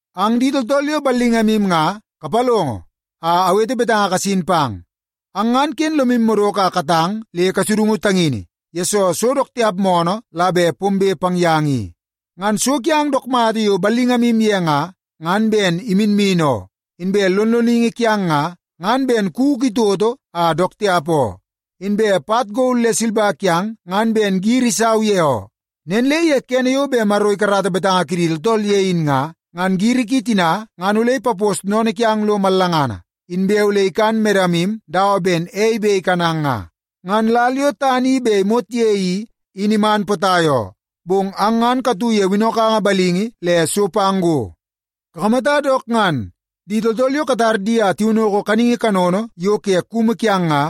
Ang di tooltool yo ballingamu nga, kapalongo a awete betanga kasin pang. Ang ngan ken lomu madoko a katang le kasudungu tangini, yesoo so dook tiap moonoo la bet pombe pang yang i. Ngan so kiang dook mata yo ballingamu ye nga, ngan ben iminmin oo, inbe lonloningi kiang nga, ngan ben kuku itoto a dook tiap oo. Inbe pat gol le silba kiang ngan ben giri isau ye oo. Nen le ye kene yo bet Maro ikarata betanga kidi tooltool ye in nga, ngan giri ki tina ngan ole ipapos sennene kiang lo mallangana, inbe ole ikan medamu dawa ben ei bet ikanang nga. Ngan lal yo tana i bet imot ye i, in iman potai oo, bong ang ngan katu ye winnokanga balingi le so pang go. Kakamata dook ngan! Di tooltool yo katar di a tiwinnoko kaningi kanono ye kumu kiang nga,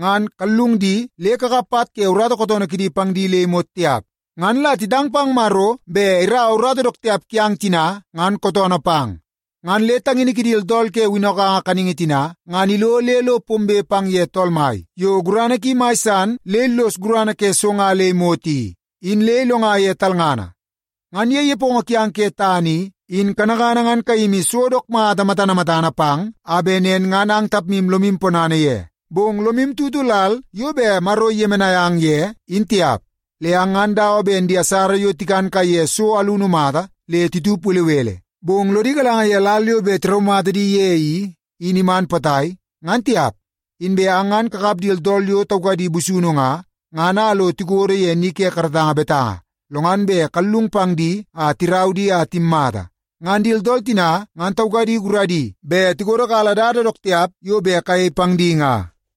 ngan kallung di le kakap pat ke urata kootoonoo kidi pang di le imot tiap. Ngan la titang pang Maro bet iraua urata dook tiap kiang tina ngan kootoonoo pang. Ngan le tangini kidi tooltool ke winnokanga kaningi tina ngan ilo le lo pombe pang ye Tool Mai yo gurana ki mai san le illos gurana ke so nga le imot i, in le ilonga ye talngana. Ngan ye nepongo kiang ke tana i, in kanakana ngan kayimi so dook mata matana matana pang a bet nen ngan ang tapmu lomu ponana ye, bong lomu tutu lal yo bet Maro iyemenai ang ye, in tiap. Le ang ngan dawa ben di asara yo tikan kaiye so alunu mata le titup belebele, bong lodi galanga ye lal yo bet tiraumata di ye i, in iman potai, ngan tiap. Inbe ang ngan kakap di tooltool yo taukadi busunu nga, ngan a lo tikodo ye ni ke karatanga betanga, lo ngan bet kallung pang di a tirau di a timmata. Ngan di tooltool tina ngan taukadi guradi bet tikodokala dada dook tiap yo bet kayei pang di nga.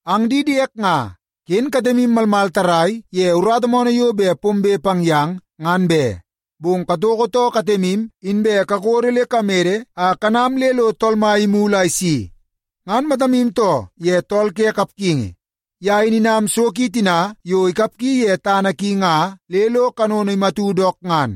Ang di diek nga, ken katemu malmal tarrai ye urata moonoo yo bet pombe pang yang ngan be, bong katoko too katemu inbe kakodo le kamede a kanam le lo Tool Mai imulu a isi. Ngan matamu too ye tool ke kapgingi. Ye in inam so ki tina yo ikapgi ye tana ki nga le lo kanono imatu dook ngan.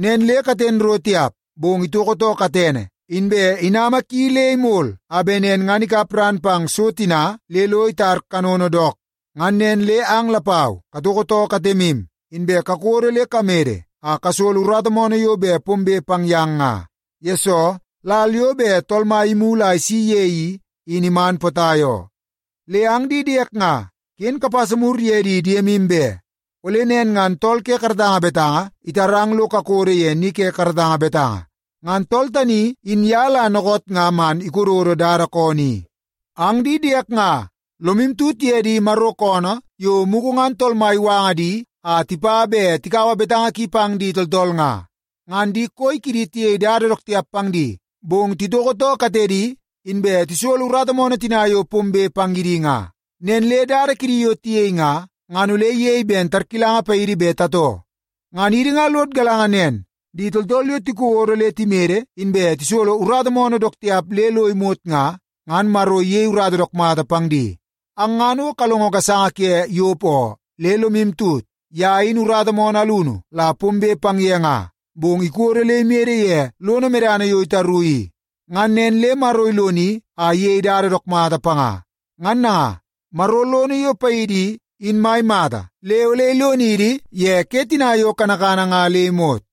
Nen le katen ro tiap, bong itoko too katene, inbe inama ki le imol a bet nen ngan ikap ran pang so tina le lo itar kanono dook. Ngan nen le ang lapau katoko too katemu, inbe kakodo le kamede a kasolo urata moonoo yo bet pombe pang yang nga, yesoo lal yo bet Tool Mai imulu a isi ye i, in iman potai oo. Le ang di diek nga, ken kapasa mur ye di diemu be. Ole nen ngan tool ke karatanga betanga itarang lo kakodo ye ni ke karatanga betanga. Ngan tool tani in ye la dookoot nga man ikododo dada koonoo i. Ang di diek nga, lomu tut ye di Maro koonoo yo mugu ngan Tool Mai iwanga di a tipa bet tikaua betanga ki pang di tooltool nga. Ngan di koi kidi tiyei dada dook tiap pang di, bong titoko too katedi, inbe tisolo urata moonoo tina yo pombe pang ye di nga. Nen le dada kidi yo tiyei nga, ngan ole iyei ben tarkilanga paidi bet tatoo. Ngan idi nga lod galanga nen, di tooltool yo tikodo le timede inbe tisolo urata moonoo dook tiap le lo imot nga, ngan Maro iyei urata dook mata pang di. Ang ngan o kalongo gasanga ke Yop oo. Le lomu tut, ye in urata moonoo alunu la pombe pang ye nga, bong ikodo le imede ye lono medana yo itaru i. Ngan nen le Maro iloni a iyei dada dook mata panga. Ngan nanga, Maro lono yo paidi i, in mai mata le ole ilonidi ye ke tina yo kanakana nga le imot.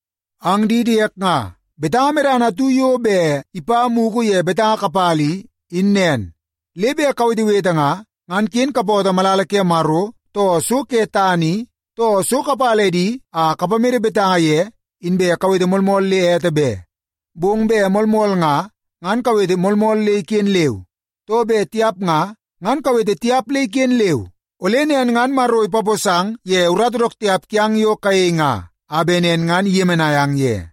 Ang di diek nga, betanga medana atu yo bet ipa mugu ye betanga kapala i, in nen. Le bet kawetewete nga, ngan ken kapootoo malala ke Maro, too so ke tana i, too so kapala edi a kapamede betanga ye, inbe kawete moolmool le ete be. Bong bet moolmool nga, ngan kawete moolmool le iken leu. Too bet tiap nga, ngan kawete tiap le iken leu. Ole nen ngan Maro ipaposang ye urata dook tiap kiang yo kayei nga, a bet nen ngan iyemenai ang ye.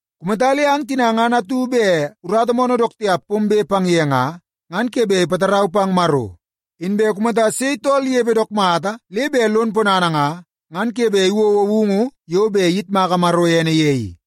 Kumata le ang tina ngan atu bet urata moonoo dook tiap pombe pang ye nga, ngan ke bet ipatarau pang Maro. Inbe kumata sei tool inepe dook mata le bet lon ponana nga, ngan ke bet iwouwou woungu yo bet iyitmaka Maro ene ye i.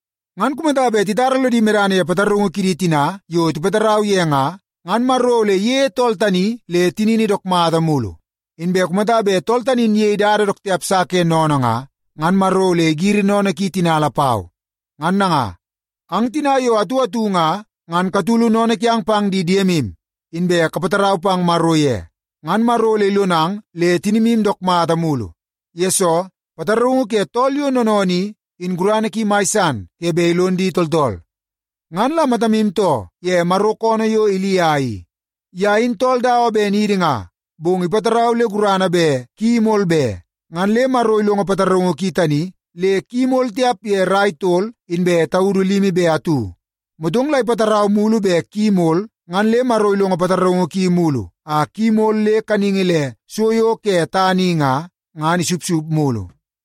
Ngan kumata bet titara lodi medana ye pataraungu kidi tina yo tipatarau ye nga, ngan Maro ole iyeie tool tani le tinini dook mata mulu. Inbe kumata bet tool tani in iyei dada dook tiap sa ke sennene nga, ngan Maro ole igiri sennene ki tina lapau. Ngan nanga, ang tina yo atu atu nga, ngan katulu sennene kiang pang di diemu, inbe kapatarau pang Maro ye. Ngan Maro ole ilonang le tinimu dook mata mulu. Yesoo, pataraungu ke tool yo noonoonoo i, in gurana ki mai san ke bet ilon di tooltool. Ngan la matamu too ye Maro koonoo yo Ilia i. Ye in tool dawa ben idi nga, bong ipatarau le gurana bet ki imol be. Ngan le Maro ilongo pataraungu ki tani le ki imol tiap ye rai tol inbe taudu limi be atu. Motong la ipatarau mulu bet ki imol, ngan le Maro ilongo pataraungu ki mulu a ki imol le kaningi le so yo ke tana i nga, ngan isupsup mulu.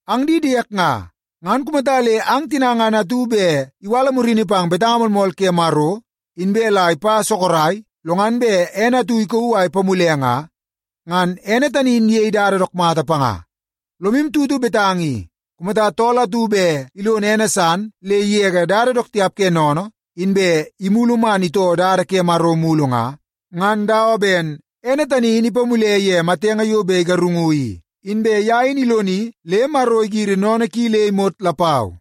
Ang di diek nga, ngan kumata le ang tina ngan atu bet iwala murini pang betanga moolmool ke Maro, inbe la ipa sorok, lo ngan bet ene atu ikauu a ipamule nga, ngan ene tani in iyei dada dook mata panga. Lomu tutu betanga i: Kumata tool atu bet ilono ene san le igege dada dook tiap ke sennene, inbe imulu man itoo dada ke Maro mulu nga, ngan dawa ben ene tani in ipamule ye matenge yo bet igarungu i, inbe ye in iloni le Maro igiri sennene ki le imot lapau.